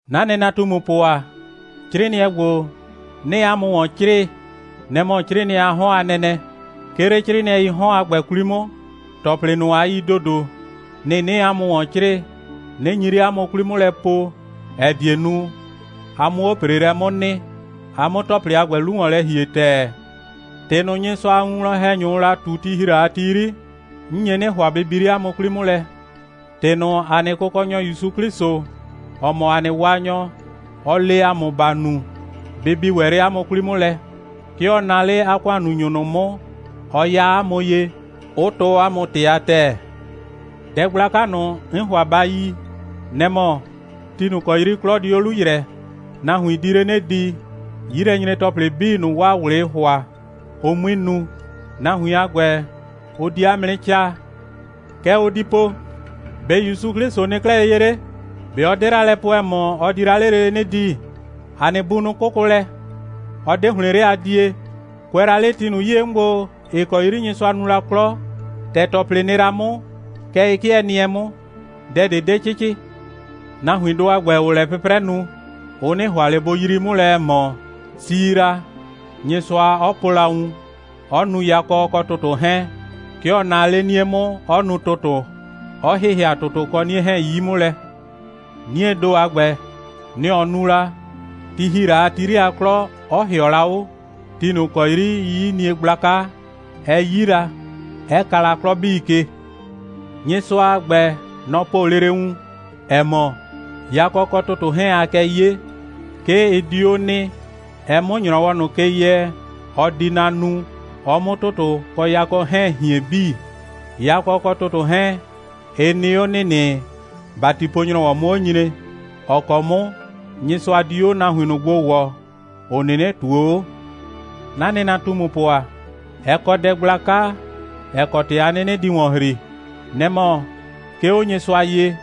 'Na nɩnatumupʋ ‑a, 'crɩɩnɩɛ ‑gbo, 'nɩɩ 'a mʋ ‑wɔn 'crɩɩ, nɛ‑ mɔ 'crɩɩnɩɛ a 'hɔn a nɛnɛ. 'Ke 'le 'crɩɩnɩɛii 'hɔn a ‑gbɛ 'kwli 'mʋ, ‑tɔplɩ ꞊nʋ, a yi ‑dodo, nɩ‑ 'nɩɩ 'a mʋ ‑wɔn 'crɩɩ, 'nɩ nyi 'le 'a mʋ 'kwli 'mʋ lɛ po, ‑ɛ die nu, a 'mʋ 'o ‑preelɛ 'mʋ nɩ, a 'mʋ ‑tɔplɩ a ‑gbɛ 'lu ‑wɔn lɛ ‑hie ‑tɛɛ. ‑Tɩ ꞊nʋ, Nyɩsʋa a winwlɔn‑hɛnyʋʋ la ꞊tu, ti ‑hi la a ti 'yri, 'n nye 'nɩ ‑hʋa, bɩ bi 'le 'a mʋ 'kwli 'mʋ lɛ. ‑Tɩ ꞊nʋ, ‑a nɩ Kʋkɔnyɔ ‑Yusu 'Klɩsʋ, ‑ɔ mɔ ‑a nɩ Waanyɔ, ɔ le 'a mʋ ba nu, bɩ bi ‑wɛ 'le 'a mʋ 'kwli 'mʋ lɛ. 'Ke ɔ naa 'le 'a ‑kʋannunyʋ ꞊nʋ 'mʋ, ɔ ya 'a mʋ ye, 'ʋ tɔɔ 'a mʋ ‑tɩ a ‑tɛɛ. Dɛ gblaka ꞊nʋ, 'n ‑hʋa ba yi, nɛ‑ mɔ: Ti ꞊nʋ ‑kɔ 'yri 'klɔ di 'o 'lu ‑yrɛɛ, nahuin di 'le 'nɩ di, 'yilɛnyre‑tɔplɩ 'bii ꞊nʋ, 'waa ꞊wlɩɩ ‑hʋa, ʋ 'mui nu. Nahuin a ‑gbɛ, ʋ di 'a mʋ 'nɩ 'caa. Kɛ ʋ di po: «‑Be' ‑Yusu 'Klɩsʋ nɩ 'klɛɛ ye 'le? ꞊Be ɔ 'de la lɛ po, ‑ɛ mɔ, ɔ di la 'le lele 'nɩ di? ‑A nɩ bunʋ 'kʋkʋ lɛ, 'ɔ 'de ‑hlɩn 'le a die. Kʋɛ la 'le ti ꞊nʋ 'yie 'mʋ gbo, ‑ɩ kɔ 'yri Nyɩsʋa nu la 'klɔ, ‑tɛ ‑tɔplɩ nɩ la 'mʋ, kɛ ɩ 'kɩɛ nɩɛ 'mʋ. Dɛ ꞊de 'de 'cɩcɩ.» Nahuindʋ a ‑gbɛ, ‑ʋʋ lɛ 'pʋprɛ nu, ʋ 'nɩ ‑hʋa ꞊le bʋ yrii 'mʋ lɛ, ‑ɛ mɔ, si la, Nyɩsʋa 'ɔ po la wun, 'ɔ nu yakɔ kɔ ‑tʋtʋ 'hɛɛn. 'Ke ɔ naa 'le 'nie 'mʋ, 'ɔ nu ‑tʋtʋ, 'ɔ ‑hɩhɩa ‑tʋtʋ kɔ 'nie 'hɛɛn 'yi 'mʋ lɛ. 'Niee ‑do a ‑gbɛ, nɛ‑ ɔ nu la, ti ‑hi la ti 'yri a 'klɔ, 'ɔ ‑hɩɔ la 'o, ti ꞊nʋ ‑kɔ 'yri 'yiyinie gblaka, ɛ 'yi la, 'ɛ ka la 'klɔ 'bii ke. Nyɩsʋa a ‑gbɛ, nɔ‑ po lele wun, ‑ɛ mɔ, yakɔ kɔ ‑tʋtʋ 'hɛɛn, aa kɛ 'ye, 'ke ɩ di 'o nɩ, ɛ 'mʋ ‑nyrɔwɔ ꞊nʋ ke yɛ, ɔ di na nu, ɔ 'mʋ ‑tʋtʋ kɔ yakɔ 'hɛɛn hien 'bii. Yakɔ kɔ ‑tʋtʋ 'hɛɛn, ɩ nɩ 'o ‑nɩnɩ, ‑batipo‑nyrɔwɔ 'mʋ 'o nyre, ‑ɔ kɔ 'mʋ Nyɩsʋa di 'o nahuin ꞊nʋ gbo ‑wɔɔ, ‑ʋ 'nɩnɩ ꞊tuo 'o. 'Na nɩnatumupʋ ‑a, ɛ kɔ dɛ gblaka, ‑ɛ kɔ ‑tɩ a 'nɩnɩ di ‑wɔn ‑hri. Nɛ‑ mɔ: 'Ke 'o Nyɩsʋa ye,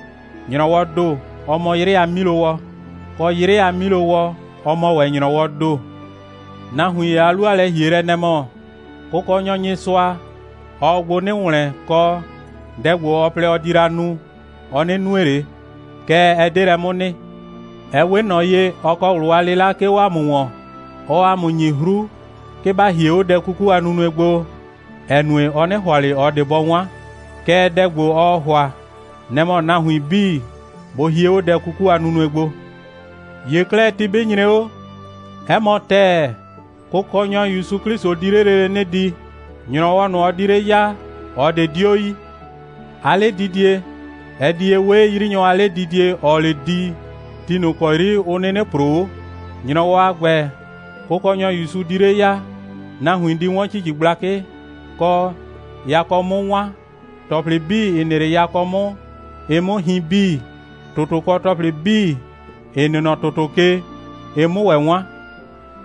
‑nyrɔwɔɔ ‑do, ɔ mɔ 'yrɩ a 'milowɔ, kɔ, 'yrɩ a 'milowɔ, ɔ mɔ ‑wɛ ‑nyrɔwɔɔ ‑do. Nahuin ‑ye a 'lu a lɛ‑hielɛ, nɛ‑ mɔ: Kʋkɔnyɔ Nyɩsʋa, ɔɔ gbo 'nɩ ‑wlɛn, kɔ, dɛ ‑gbo, ɔ plɛ, ɔ di la nu, ɔ 'nɩ nue ꞊le. Kɛɛ, ɛ 'de lɛ 'mʋ nɩ. Ɛ 'we ꞊nɔ ye, ɔ kɔ ꞊wlʋ a 'lɩla, 'ke 'o 'a mʋ ‑wɔn. Ɔɔ 'a mʋ ‑nyi 'hru, 'ke ba hie 'o dɛ 'kuku a nunue gbo, ‑ɛ nue, ɔ 'nɩ ‑hʋa ꞊le ꞊ɔ ꞊de bɔ 'wan. Kɛɛ, dɛ ‑gbo, ɔɔ ‑hʋa, nɛ‑ mɔ nahuin 'bii bʋ hie 'o dɛ 'kuku a nunue gbo. ‑Ye 'klɛɛ, ti 'bɩ nyre 'o, 'ɛ mɔ ‑tɛɛ, Kʋkɔnyɔ ‑Yusu 'Klɩsʋ di 'le lele 'nɩ di. ‑Nyrɔwɔ ꞊nʋ, ɔ di 'le ya, ꞊ɔ ꞊de 'dio yi. 'A 'ledidie, ɛ di ye 'we 'yrinyɔ a 'ledidie, ‑ɔɔ 'le di, ti ꞊nʋ ‑kɔ 'yri ʋ 'nɩnɩ ‑proo 'o. ‑Nyrɔwɔ a ‑gbɛ, Kʋkɔnyɔ ‑Yusu di 'le ya, nahuin di 'wɔn ‑cici gblakɩ, kɔ, yakɔ 'mʋ 'wan, ‑tɔplɩ 'bii, ‑ɩ nɩ 'le yakɔ 'mʋ, ɩ 'mʋ hin 'bii, ‑tʋtʋ kɔ ‑tɔplɩ 'bii, ‑ɩ nɩ nɔ ‑tʋtʋ ke, ɩ 'mʋ ‑wɛ 'wan.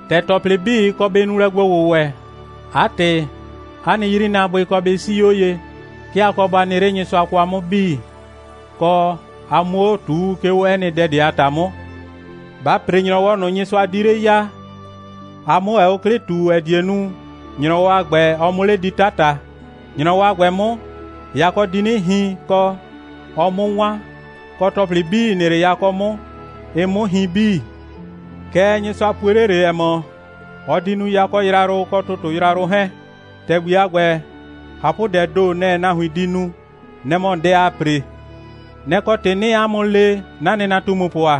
‑Tɛ ‑tɔplɩ 'bii, ɩ kɔ bɩ nu lɛ gbo‑wʋwɛ, 'a ‑tɩ, 'a nɩ 'yrinaabʋɩ kɔ bɩ 'sii 'o ye. 'Ke a kɔ ba nɩ 'le Nyɩsʋa kwa 'mʋ 'bii, kɔ, a 'muo 'o ꞊tuu, 'ke 'o 'ɛ nɩ dɛ ꞊de a ‑ta 'mʋ. Ba ‑pre ‑nyrɔwɔ ꞊nʋ, Nyɩsʋa di 'le ya, a 'mʋ ‑wɛ 'o 'klɩ ꞊tu, ‑ɛ die nu, ‑nyrɔwɔ a ‑gbɛ, ɔ 'mʋ 'le di 'tata. ‑Nyrɔwɔ a ‑gbɛ 'mʋ, yakɔ di 'nɩ hin, kɔ, ɔ 'mʋ 'wan, kɔ, ‑tɔplɩ 'bii, ‑ɩ nɩ 'le yakɔ 'mʋ, ɩ 'mʋ hin 'bii. Kɛɛ, Nyɩsʋa pue 'le ꞊le, ‑ɛ mɔ, ɔ di nu yakɔ yrayrʋ kɔ ‑tʋtʋ yrayrʋ 'hɛɛn. ‑Tɛgbi a ‑gbɛ, ꞊hapʋdɛɛ ‑do, nɛ‑ nahuin di nu. Nɛ‑ mɔ dɛ ‑aa ‑pre. Nɛ‑ kɔ ‑tɩ, 'nɩɩ 'a mʋ le, 'na nɩnatumupʋ ‑a,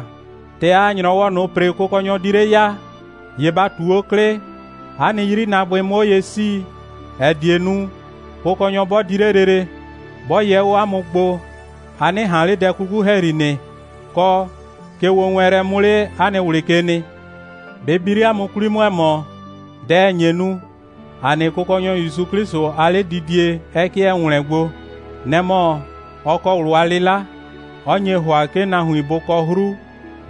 ‑tɛ aa ‑nyrɔwɔ ꞊nʋ ‑pre, Kʋkɔnyɔ di 'le ya, ‑ye ba ꞊tu 'o 'klɩ, 'a nɩ 'yrinaabʋɩ 'mʋ 'o ye 'sii, ‑ɛ die nu, Kʋkɔnyɔ 'bɔ di 'le lele, 'bɔ yɛ 'o 'a mʋ gbo, a 'nɩ ꞊han 'le dɛ 'kuku ‑hɛyri nɩ, kɔ, kegbowɛɛnlɛ 'mʋ 'le 'a nɩ ꞊wlɩ ke nɩ. Bɩ bi 'le 'a mʋ 'kwli 'mʋ, ‑ɛ mɔ, dɛ ‑nye nu, ‑a nɩ Kʋkɔnyɔ ‑Yusu 'Klɩsʋ, 'a 'ledidie 'ɛ 'kɩɛ ‑wlɛɛn gbo, nɛ‑ mɔ, ɔ kɔ ꞊wlʋ a 'lɩla, 'ɔ nye ‑hʋa, 'ke nahuin bʋ kɔ 'hru,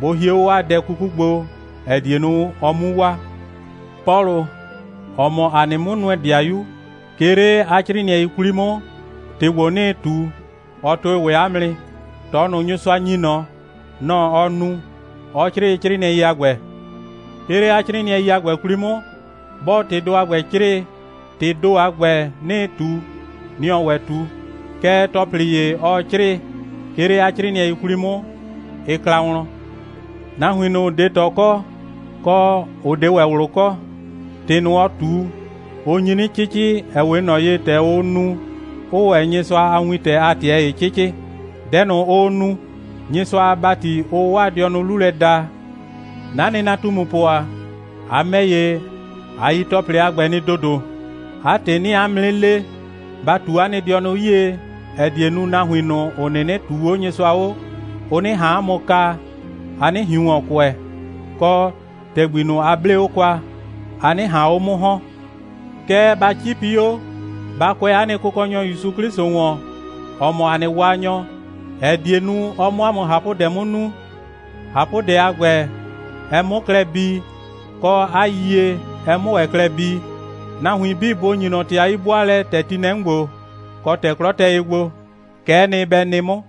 bʋ hie 'o 'waa dɛ 'kuku gbo, ‑ɛ die nu, ɔ 'mu waa. Pɔlʋ, ‑ɔ mɔ ‑a nɩ 'mʋnʋɛ‑dɩayu, 'ke 'le 'a 'crɩɩnɩɛi 'kwli 'mʋ, ‑tɩ ‑gbo, 'nɩɩ ꞊tu, ɔ tʋɩ ‑wɛ 'a mʋ nɩ. ꞊Tɔ ꞊nʋ, Nyɩsʋa ‑nyi ꞊nɔ, nɔ‑ ɔ nu, 'ɔ 'crɩɩ 'crɩɩnɩɛi a ‑gbɛ. 'Ke 'le 'a 'crɩɩnɩɛi a ‑gbɛ 'kwli 'mʋ, 'bɔɔ ‑tɩdʋ a ‑gbɛ 'crɩɩ, ‑tɩɩ ‑do a ‑gbɛ, 'nɩɩ ꞊tu, nɩ‑ ɔɔ ‑wɛ ꞊tu. Kɛɛ, ‑tɔplɩ ‑ye, ɔɔ 'crɩɩ, 'ke 'le 'a 'crɩɩnɩɛi 'kwli 'mʋ, ɩ kla wlɔn. Nahuin ꞊nʋ, ‑ʋ 'de ꞊tɔ kɔ, kɔ, ‑ʋ 'de ‑wɛ ꞊wlʋ kɔ, ‑tɩ ꞊nʋ, ɔɔ ꞊tu, ʋ nyi 'nɩ 'cɩcɩ, ‑ɛ 'we ꞊nɔ ye, ‑tɛ ʋʋ nu, 'ʋʋ ‑wɛ Nyɩsʋa a wintɛ a ꞊tɩɛ ‑ye 'cɩcɩ. Dɛ ꞊nʋ, ʋʋ nu, Nyɩsʋa a ‑bati ʋʋ 'waa dɩɔnʋ 'lu lɛ daa. 'Na nɩnatumupʋ ‑a, a ‑mɛ ‑ye, a yi ‑tɔplɩ a ‑gbɛ nɩ ‑dodo. 'A ‑tɩ, 'nɩɩ 'a mʋ 'nɩ le, ba ꞊tu 'a nɩ dɩɔnʋ 'yie, ‑ɛ die nu, nahuin ꞊nʋ, ‑ʋ 'nɩnɩ ꞊tuu 'o Nyɩsʋa 'o, ʋ 'nɩ ꞊han 'a mʋ kaa, a 'nɩ ꞊hiun ‑wɔn kʋɛ, kɔ, ‑tɛgbi ꞊nʋ, a 'blee 'o kwa, a 'nɩ ꞊han 'o 'mʋ ‑hɔn. Kɛɛ, ba 'cipi 'o, ba kʋɛ ‑a nɩ Kʋkɔnyɔ ‑Yusu 'Klɩsʋ ‑wɔn, ‑ɔ mɔ ‑a nɩ Waanyɔ, ‑ɛ die nu, ɔ 'mʋ 'a mʋ ꞊hapʋdɛ 'mʋ nu, ꞊hapʋdɛ a ‑gbɛ ɛ 'mʋ klɛ bii, kɔ, 'a yiyie, ɛ 'mʋ ‑wɛ klɛ bii. Nahuin 'bii bʋ ‑nyi ꞊nɔ ‑tɩ a 'yi'bʋaalɛ, ‑tɛ ti nɩ lɛ 'mʋ ‑gbo, kɔ, ‑tɛ 'klɔ tɛ ye gbo. Kɛ'ɛ nɩ, bɛ nɩ 'mʋ.